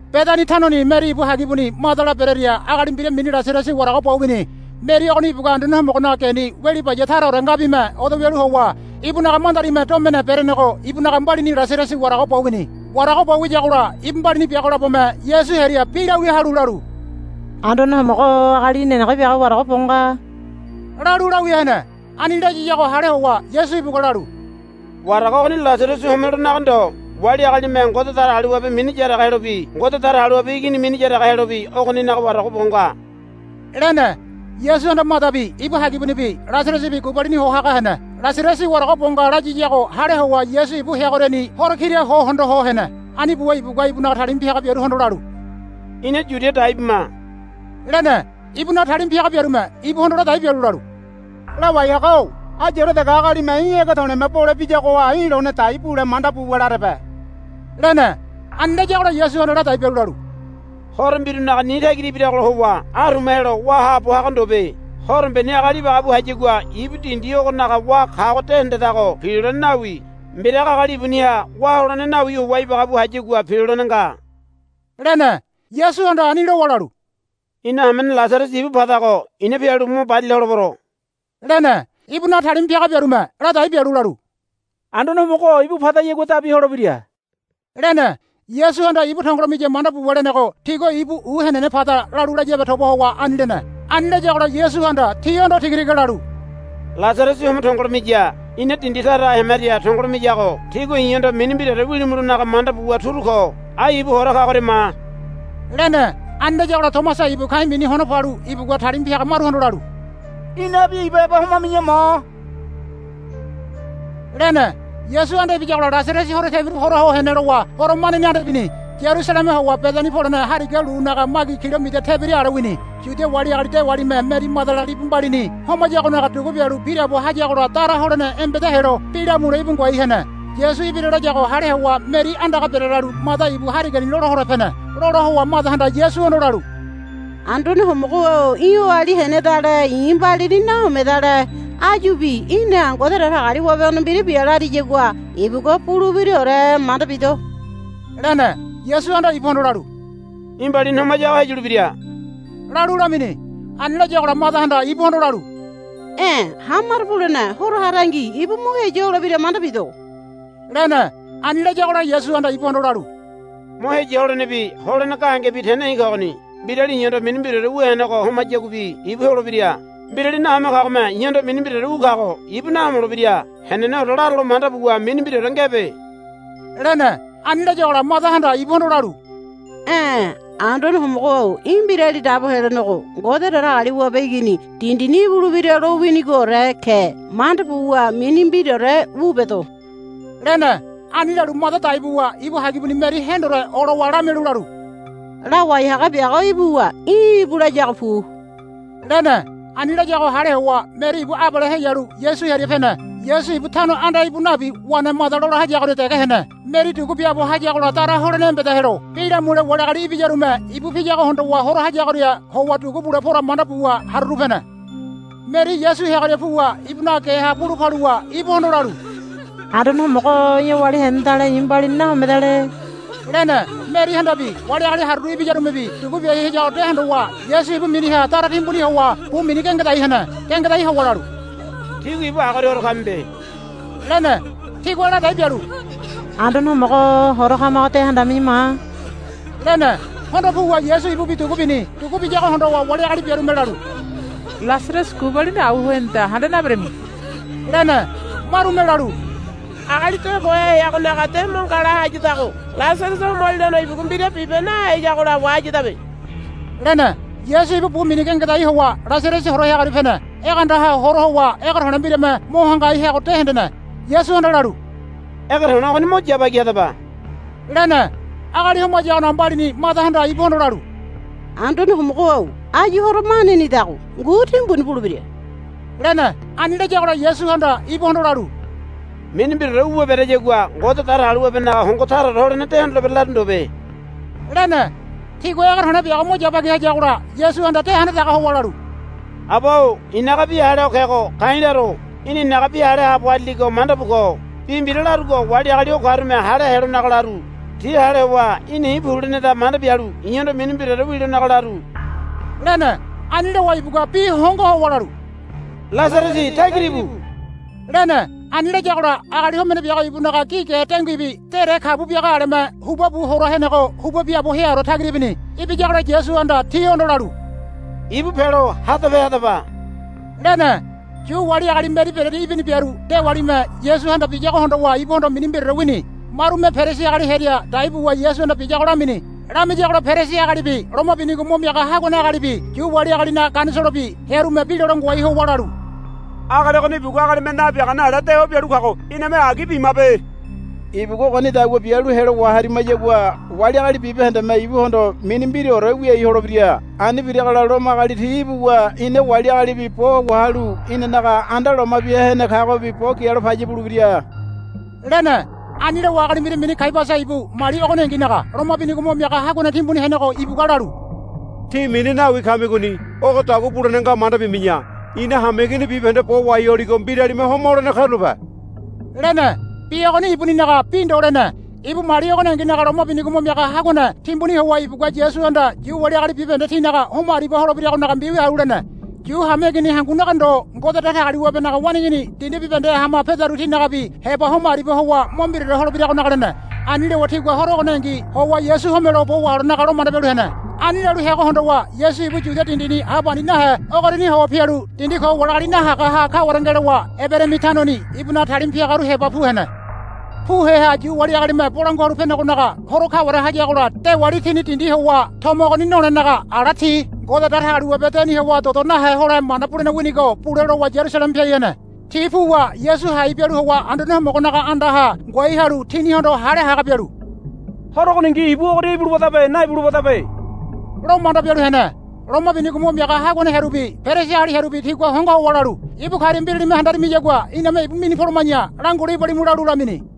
Bedani tanoni Meri ibu hagibuni Madala berearia agali mbira mini Lasarasi warago bo wini. Meri ogoni ibugua Anduane Homogonaga geni weli baya taraore ngabime odo wialu howa ibunaga mandarime domene berenego ibunaga mbalini Lasarasi warago bo wini. Warago bo wiyagola ibu mbalini biago labome Yasu hearia bi lawia halu lalu, Anduane Homogo-o agali í̠ nenege biago warago bo nga, lalu lawia hene. Ani layiyago hale howa Yasu ibugua lalu, Warago ogoni Lasarasi homelonaga ndo. Wali agalime Ngode Datagaliwabe mini yaraga helobi Ngode Datagaliwabe Igini mini yaraga helobi ogoninaga warago bo nga, lene. Yasuhanda Madabi ibu hagibunibi Lasarasibi gubalini ho haga hene. Lasarasi warago bo nga layiyago hale howa Yasu ibu heagoriani horo kira ho hondo ho hene. Ani buwa ibugua ibunaga talima piaga biaruhondo lalu, Ina Yudia dai bima, lene. Ibunaga talima piaga biarume ibuhondo ladai bialu lalu, Lawai haga-o ayure dege agalime í̠ ege to̱le̱me bole biyagoha í̠ lone dai bule manda buwa larebe, lene. Ani layagola Yasuhanda ladai bialu lalu, Horo mbirunaga ni tagira ibiragola howa aruma helo wá haabo haga ndobe. Horombeni agali ibagabu hayagua ibu dindi ogonaga wá kago de hendedago pilolene nawi. Mbiraga agali ibuniha wá holene nawi howa ibagabu hayagua pilolene nga, lene. Yasuhanda ani lowa lalu, Ina hamene Lasarasi ibu padago i̱na pialu mo barila holebero, lene. Ibunaga talima piaga biarume ladai bialu lalu, Anduane Homogo-o ibu padayagua dabi holebira, lene. Yasuhanda ibu tongolo miya manda buwa lenego tigua ibu u henene pada lalu layabe toba howa ani lene. Ani layagola Yasuhanda tihondo tiga tiga lalu, Lasarasi homo tongolo miya. Ina dindi taraha hemaria tongolo miyago tígua i̱hondo mini mbiraore wilimulonaga manda buwa turu ko. Ai ibu hora kagoria ma, lene. Ani layagola Tomasa ibu ka̱i̱ mini Hono Palu ibugua talima piaga maruhondo lalu, Inabi ibu heba homami̱ya ma, lene. Yasu anda ibiyagola Lasarasi horo tebiru hora ho hene lowa horo maneni anda ibini. Yarusaleme howa Bedani polene hariga lunaga magi kilomida tebira ale wini. Yudia wali agali dewalime Meri Madala libu mbalini homayagonaga dugu bialu biraabo hayagola dara holene embeda helo bi lamule íbu ngoai hene. Yasu ibira layago hale howa Meri andaga berelalu Mada ibu harigani lola hole pene. Lola howa Madahanda Yasuhondo lalu, Anduane Homogo-o í̠ oali henedale i̱ mbalini nahomedale. Áyubi í̠na Ngode Datagaliwabehondo mbira bia lariyagua ibugua bulebiraore manda bido, lene. Yasuhanda ibuhondo lalu, Í̠ mbalini homayago heyulebira, lalu lamini. Ani layagola Madahanda ibuhondo lalu, E̱ hamaro bulene horo harangi ibu mo heya holebira manda bido, lene. Ani layagola Yasuhanda ibuhondo lalu, Mo heya holenebi holene gahengebi tene i̱ kogoni. Mbirali i̱hondo mini mbiraore wu henego homayaguabi ibu holebira. Mbirali nahome kagome i̱hondo mini mbiraore wu kago ibu nahomolebira. Heneneore laralo manda buwa mini mbiraore ngebe, lene. Ani layagola Madahanda ibuhondo lalu, E̱ Anduane Homogo-o í̠ Mbirali Dabo Helenego Ngode Datagaliwabe Igini dindini ibulebira lowinigoore ke manda buwa mini mbiraore wu bedo, lene. Ani lalu Mada dai buwa ibu hagibuni Meri hendore olowa lamialu lalu, Lawai haga biago ibuwa í̠ íbu layago pu, lene. Ani layago hale howa Meri ibu abale heyalu Yasu hearia pene. Yasu ibu tano anda íbu nabi wene Mada lola hayagoria dege hene. Meri dugu biaabo hayagola dara holene embeda helo bi lamule wali agali ibiyarume ibu piyago hondowa hora hayagoria howa dugu bule pora manda buwa haruru pene. Meri Yasu heagoria puwa ibunaga geha bulu paluwa ibuhondo lalu, Anduane Homogo-o í̠ oali henedale i̱ mbalini nahomedale, lene. Merihandabi wali agali haruru ibiyarumebi dugu biai hayago de hondowa Yasu ibu miniha dara timbuni howa bu mini gengedai hene. Gengedai howa lalu, Tígua ibu agoria hora kamibe, lene. Tigua ladai bialu, Anduane Homogo-o hora kamago de handami̱ya ma, lene. Hondo puwa Yasu ibubi dugu bini. Dugu biyago hondowa wali agali biarume lalu, Lasarasi gubalini au ho heneda handa naberami, lene. Marume lalu, Agali de kohe heagonaga de mo ngala hayadago Lasarasi homolilono ibugua mbira bibe naheyagola wahayadabe, lene. Yasu ibu bu mini gengedai howa Lasarasi hora heagoria pene. Egeandaha hora howa ege to̱le̱ mbirame mo hangai heago de hendene. Yasuhanda lalu, Ege to̱le̱ ogoni mo yabagi hadaba, lene. Agali homayagonaga mbalini Madahanda ibuhondo lalu, Anduane Homogo-o áyu horo manenidago ngu timbuni bulebira, lene. Ani layagola Yasuhanda ibuhondo lalu, Mini mbiraore wuwa bereyagua Ngode Datagaliwabenaga hongo taraore holene de hondolebere laru ndobe, lene. Tigua ege to̱le̱ biago mo yabagi hayagola Yasuhanda de handadaga howa lalu, Aba-o i̱naga bi hale ho kego ka̱i̱ laro. Í̠na i̱naga bi hale haabo harili manda bu ko. Bi mbira larugo wali agali o karume hale helonaga laru. Ti hale howa í̠na i̱ pu leneda manda bialu i̱hondo mini mbiraore wilonaga laru, lene. Ani lowa ibugua bi hongo howa lalu, Lasarasi tagira íbu, lene. Ani layagola agali homene biago ibunaga gi ge denguibi dere kabu biaga aleme huba bu hora henego huba biaabo heaore tagira ibini. Ibiyagola Yasuhanda tihondo lalu, Ibu pelo hadape hadaba, lene. Yu wali agali Meri bereria ibini biaru dewalime Yasuhanda biyago hondowa ibuhondo mini mbiraore wini. Marume Perisi agali hearia dai buwa Yasuhanda biyago lamini. Lamiyagola Perisi agalibi loma binigo mo miaga haguane agalibi Yu wali agalinaga Ganisolobi hearume bi lole ngoai howa lalu, Agali ogoni ibugua agalime nabiagane ale dewa bialu kago iname agi bimabe. Ibugua ogonidagua bialu helo waharimayagua wali agali bibahendeme ibuhondo mini mbiraore wiai holebira. Ani biragola Lomo agali ti ibuwa ina wali agalibi bo wahalu inanaga anda loma bia hene kagobi bo gialo paya bulebira, lene. Ani lowa agali mbira mini Kaiabasa ibu mali ogoninginaga loma binigo mo miaga haguane timbuni henego ibugua lalu, Tí mini nawi kamigoni. Ogodagua bulene nga manda bimi̱ya. Ina hameigini bibahende bo wahai holigo mbiralime homa holene karulape, lene. Bi ogoni ibuninaga bi ndo lene. Ibu mali ogoninginaga loma binigo mo miaga haguane timbuni howa ibugua Yasuhanda Yu wali agali bibahende tinaga homa aribia holebiragonaga mbiwia halu lene. Yu hameigini hangunaga ndo Ngode Datagaliwabenaga waneigini dindi bibahendeha hama pedaru tinagabi heba homa aribia howa mo mbiraore holebiragonaga lene. Ani lowa tigua horo ogoningi howa Yasu homelo bo waholenaga lo manda bialu hene. Ani lalu heago hondowa Yasu ibu Yudia dindini ha pani nahe ogoriani howa pialu dindi ko wali agali nahagaha kaware ngelowa Eberaimi tanoni ibunaga talima piagaru heba pu hene. Pu heaha Yu wali agalime Bolangua Halu Penegonaga Horo kaware hayagola dewali tini dindi howa tomo ogoni nolenaga ala ti Ngode Datagaliwabe deni howa dodo nahe hole mana bulene winigo bule lowa Yarusaleme piai hene. Ti puwa Yasu hai bialu howa Anduane Homogonaga andaha ngoai halu tinihondo hale haga bialu, Horo ogoningi ibu ogoria ibulebadabe naibulebadabe, lo manda bialu hene. Loma binigo mo miaga haguane hearubi Perisi agali hearubi tigua hongo howa lalu, Ibu karia mbiralime handarimiyagua iname ibu minu poloma̱ya langule ibalimu, lalu lamini.